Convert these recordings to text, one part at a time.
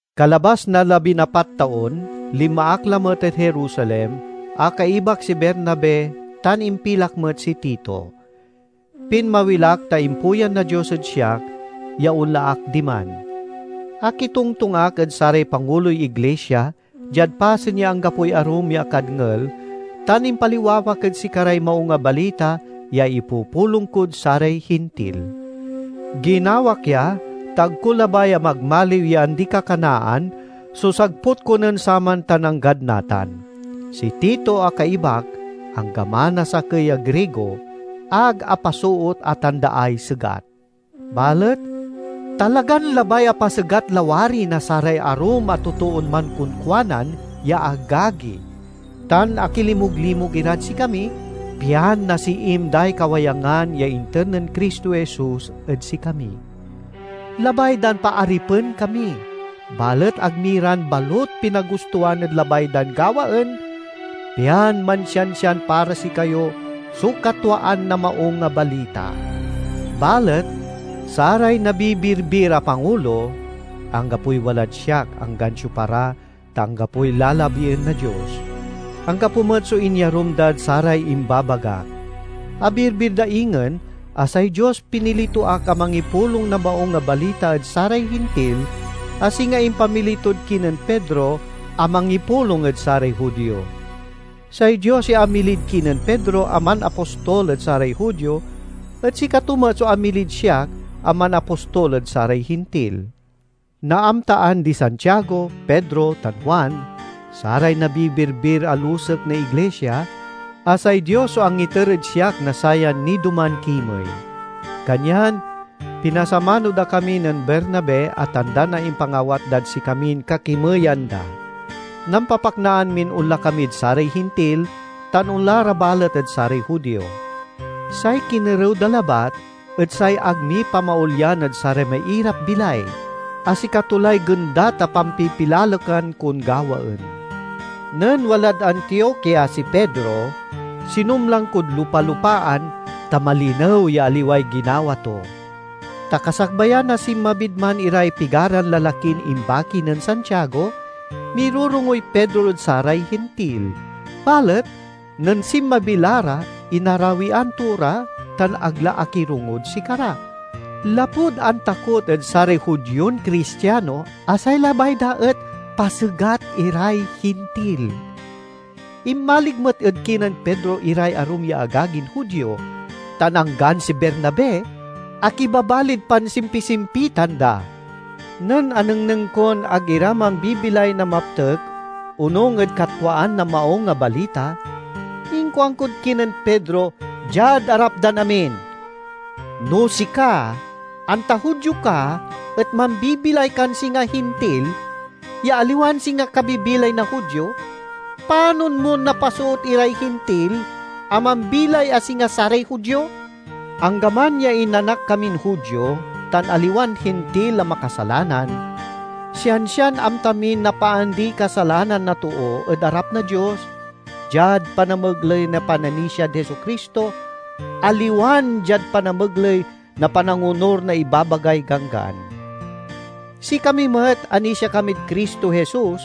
Kalabas na labinapat taon linma ak lamet ed Jerusalem a kaibak si Bernabe, tan impilak met si Tito. Pinmawil ak ta impuyan na Dios ed siak ya onla ak diman. Akitongtong ak ed saray panguloy iglisia diad pasen ya anggapoy arum ya akadngel, tan impaliwawak ed sikaray Maung a Balita ya ipupulong kod saray Hintil. Ginawak ya, ta ag ko labay a magmaliw ya andi-kakanaan so sagput ko nen saman tan anggad natan. Si Tito a kaibak, anggaman a sakey a Grigo, ag apasoot a tandaay segat. Balet talagan labay a pasegat lawari na saray arum a totoon mankonkuanan ya agagi tan akilimuglimug irad sikami, pian nasiim day kawayangan ya inter nen Cristo Jesus ed sikami. Labay dan paaripen kami, balet ag mi ran balut pinagustoan ed labay dan gawaen, pian mansiansian para sikayo so katwaan na Maung a Balita. Balet saray nabibirbir a pangulo—anggapoy walad siak, anggan siopa ra, ta anggapoy lalabien na Dios—anggapo met so inyarum dad saray imbabagak. Abirbir da ingen a say Dios pinili to ak a mangipulong na Maung a Balita ed saray Hintil, a singa impamili tod kinen Pedro a mangipulong ed saray Judio. Say Dios ya amilid kinen Pedro a manapostol ed saray Judio et sikato met so amilid siak a manapostol ed saray Hintil. Naamtaan di Santiago, Pedro, tan Juan, saray nabibirbir a lusek na iglisia, a say Dios so angiter ed siak na sayan nidoman kimey. Kanyan pinasamano da kami nen Bernabe a tanda na impangawat dad sikamin kakimeyan da. Nampapaknaan min onla kamid saray Hintil, tan onla ra balet ed saray Judio. Say kinerew da labat et say ag mi pamaolyan ed saray mairap-bilay, a sikato lay gendat a pampipilalekan kon gawaen. Nen walad Antiokia si Pedro, sinumlang kod lupa-lupaan ta malinew ya aliway ginawa to. Ta kasakbayan a sinmabid man iray pigaran lalakin imbaki nen Santiago, mirorongoy Pedro ed saray Hintil. Balet nen sinmabi la ra, inarawian to ra tan ag la akirongod sikara, lapud antakot ed saray Judion Cristiano a say labay da et pasegat iray Hintil. Inmalig met ed kinen Pedro iray arum ya agagin Judio; tan anggan si Bernabe akibabalid pansimpisimpitan da. Nen anengneng kon ag ira mambibilay na maptek onung ed katwaan na Maung a Balita, inkuankod kinen Pedro diad arap dan amin, "No sika, anta Judio ka et mambibilay kan singa Hintil, ya aliwan singa kabibilay na Judio, panon mon napasoot iray Hintil a mambilay a singa saray Judio?" Anggaman ya inanak kamin Judio, tan aliwan Hintil a makasalanan, sian-sian amta min napaandiy kasalanan na too ed arap na Dios diad panamegley na pananisiad Jesu-Cristo, aliwan diad panamegley na panangonur na ibabagay Ganggan. Sikami met anisia kamid Cristo Jesus,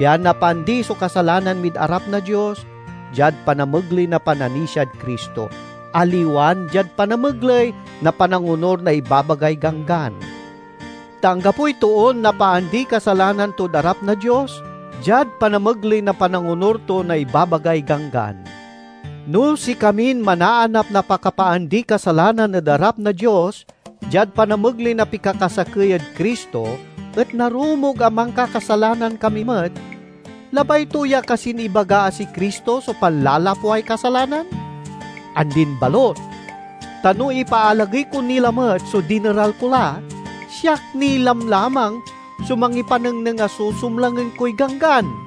pian napaandi so kasalanan mid arap na Dios diad panamegley na pananisiad Cristo, aliwan diad panamegley na panangonur na ibabagay Ganggan. Ta anggapoy toon napaandiy kasalanan tod arap na Dios diad panamegley na panangonur to na ibabagay Ganggan. No sikamin manaanap na pakapaandiy kasalanan ed arap na Dios diad panamegley na pikakasakey ed Cristo et narumog a mankakasalanan kami met, labay to ya kasin ibaga a si Cristo so panlalapway kasalanan? Andin balut! Ta no ipaalagey ko ni lamet so dineral ko la, siak ni lamlamang so mangipanengneng a susumlangen koy Ganggan.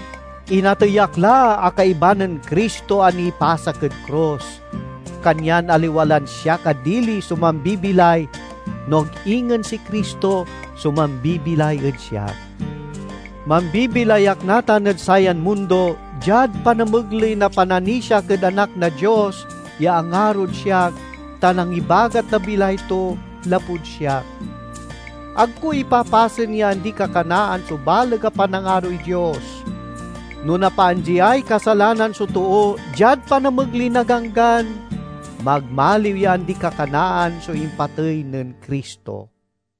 Inatey ak la a kaiba nen Cristo a nipasak ed krus, kanyan aliwa lan siak a dili so mambibilay, no ag ingen si Cristo so mambibilay ed siak. Mambibilay ak natan ed sayan mundo diad panamegley na pananisiak ed Anak na Dios ya angarod siak tan angibagat na bilay to lapud siak. Ag ko ipapasen ya andi-kakanaan so baleg a panangaroy Dios. No napaandiay kasalanan so too diad panamegley na Ganggan, magmaliw ya andi-kakanaan so impatey nen Cristo.